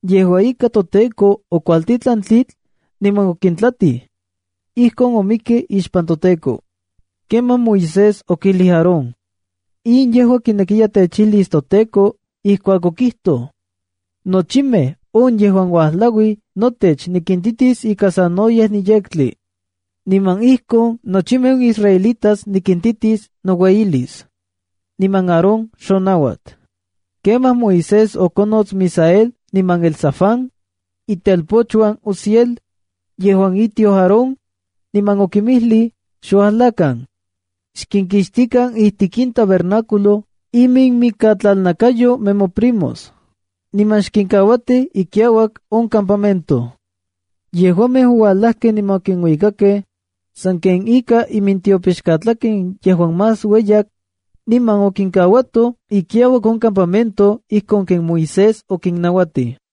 Yejua ika, toTEKO okuajtitlan tlitl, niman okintlatij. Ijkon omikkej ixpan toTEKO. Kemaj Moisés okijlij Aarón —In yejua kinekiya techijlis toTEKO ijkuak okijtoj: “Nochimej on yejuan uajlauij notech nikintitis ika sanoyej niyektli.” Niman ijkon nochimej on israelitas nikintitis noueyilis. Niman Aarón xonauat. Kemaj Moisés okonots Misael niman Elzafán, itelpochuan Uziel, yejuan itioj Aarón, niman okinmijlij —Xuajlakan. Xkinkixtikan ijtik in tabernáculo iminmikatlalnakayo nemoprimos, niman xkinkauatij ikiauak on campamento. Yejuamej ouajlakej niman okinuikakej, sanken ika imintiopixkatlaken yejuan más ueyak, niman okinkauatoj ikiauak on campamento ijkon ken Moisés okinnauatij.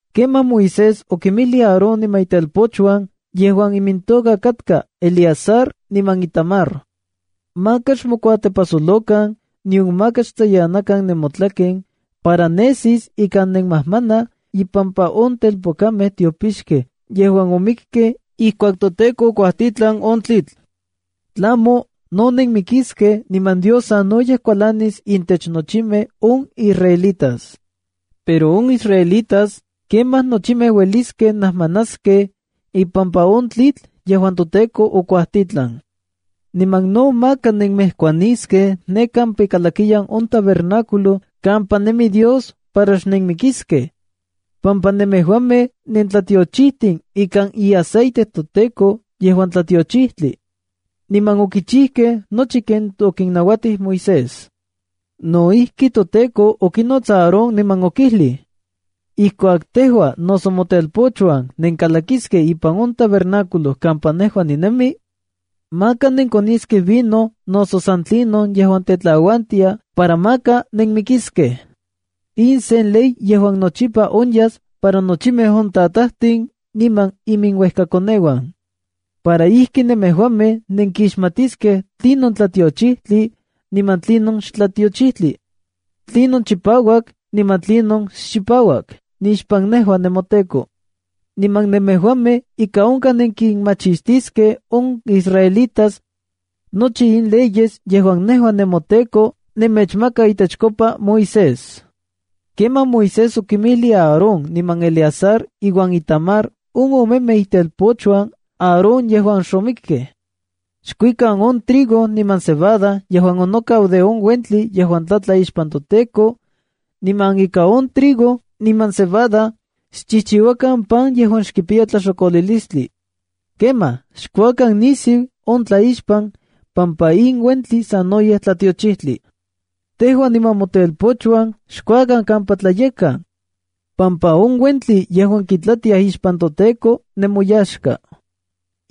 Kemaj Moisés okinmijlij Aarón niman itelpochuan yejuan imintoka katka Eleazar niman Itamar —Maka xmokuatepajsolokan, nion maka xtsayanakan nemotlaken para nesis ika nenmajmanaj impampa on telpokamej tiopixkej yejuan omikkej ikuak toTEKO okuajtitlan on tlitl. Tlamo, no nenmikiskej niman Dios sanoyej kualanis intech nochimej on israelitas. Pero on israelitas, kemaj nochimej ueliskej najmanaskej ipampa on tlitl yejuan toTEKO okuajtitlan. Niman no maka nenmejkuaniskej ne kampa ikalakiyan on tabernáculo kampa nemi Dios para xnenmikiskej, pampa nemejuamej nentlatiochijtin ikan iaceite toTEKO yejuan tlatiochijtli. Niman okichijkej nochi ken okinnauatij Moisés. No ijki, toTEKO okinots Aarón niman okijlij: “Ijkuak tejua noso motelpochuan nenkalakiskej ipan on tabernáculo kampa nejua ninemi, maka nenkoniskej vino noso san tlinon yejuan tetlauantia para maka nenmikiskej. In sen ley yejuan nochipa onyas para nochimej on tatajtin niman iminuejkakoneuan, para ijki nemejuamej nenkixmatiskej tlinon tlatiochijtli niman tlinon xtlatiochijtli, tlinon chipauak niman tlinon xchipauak nixpan nejua nemoTEKO. Niman nemejuamej ika onkaj nenkinmachistiskej on israelitas, nochi in leyes yejuan nejua nemoTEKO nemechmaka itechkopa Moisés.” Kemaj Moisés okimilij Aarón niman Eleazar iuan Itamar on omemej itelpochuan Aarón yejuan xomikkej: —Xkuikan on trigo niman cebada yejuan onokau de on uentli yejuan tlatla ixpan toTEKO, niman ika on trigo niman cebada xchijchiuakan pan yejuan xkipiya tlaxokolilistli. Kemaj xkuakan nisiu on tlaixpan, pampa in uentli sanoyej tlatiochijtli. Tejua niman motelpochuan xkuakan kampa tlayekkan, pampa on uentli yejuan kintlatiaj ixpan toTEKO nemoyaxka.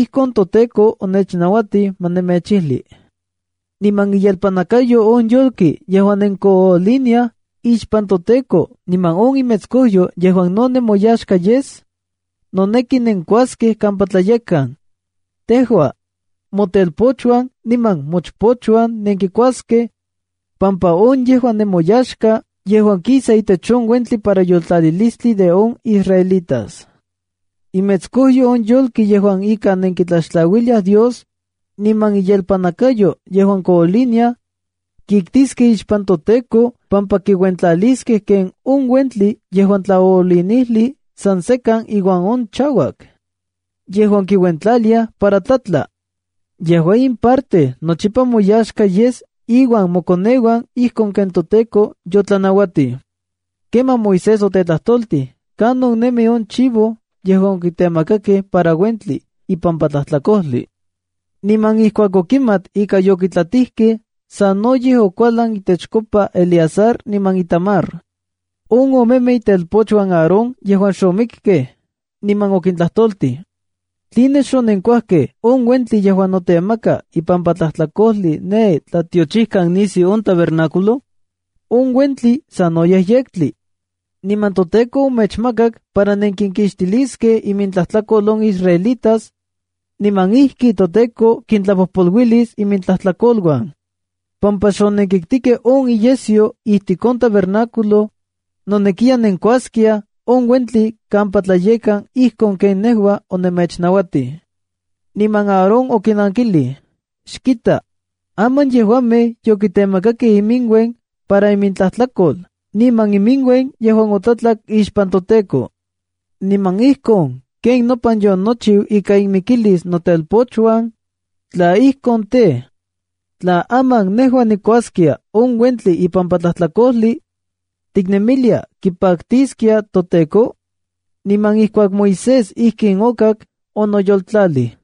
Ijkon toTEKO onechnauatij ma nemechijli. Niman iyelpannakayo on yolki yejuan nenkooliniaj ixpan toTEKO niman on imetskojyo yejuan no nemoyaxka yes, noneki nenkuaskej kampa tlayekkan. Tejua, motelpochuan niman mochpochuan nenkikuaskej, pampa on yejua nemoyaxka yejuan kisa itech on uentli para yoltlalilistli de on israelitas. Imetskojyo on yolki yejuan ika nenkitlaxtlauiliaj Dios, niman iyelpannakayo yejuan kooliniaj, kiktiskej ixpan toTEKO pampa kinuentlaliskej ken on uentli yejuan tlaoolinijli san sekan iuan on chauak yejuan kiuentlaliaj para tlatla. Yejua in parte nochipa moyaxka yes iuan mokoneuan ijkon ken toTEKO yotlanauatij. Kemaj Moisés otetlajtoltij kanon nemi on chivo yejuan okitemakakej para uentli ipampa tlajtlakojli. Niman ijkuak okimat ika yokitlatijkej, sanoyej okualan itechkopa Eleazar niman Itamar, on omemej itelpochuan Aarón yejuan xomikkej. Niman okintlajtoltij: —¿Tline xonenkuajkej on uentli yejuan notemaka ipampa tlajtlakojli ne tlatiochikan nisiu on tabernáculo? On uentli sanoyej yektli, niman toTEKO omechmakak para nenkinkixtiliskej imintlajtlakol on israelitas, niman ijki toTEKO kintlapojpoluilis imintlajtlakoluan. Pampa xonenkiktikej on iyesyo ijtik on tabernáculo, nonekiya nenkuaskiaj on uentli kampa tlayekkan ijkon ken nejua onemechnauatij. Niman Aarón okinankilij: —Xkita, aman yejuamej yokitemakakej iminuen para imintlajtlakol niman iminuen yejuan otlatlak ixpan toTEKO. Niman ijkon ken nopan yonochiu ika inmikilis notelpochuan, tla ijkon tej, tla aman nejua nikuaskia on uentli ipampa tlajtlakojli, ¿tiknemilia kipaktiskia toTEKO? Niman ijkuak Moisés ijkin okak, onoyoltlalij.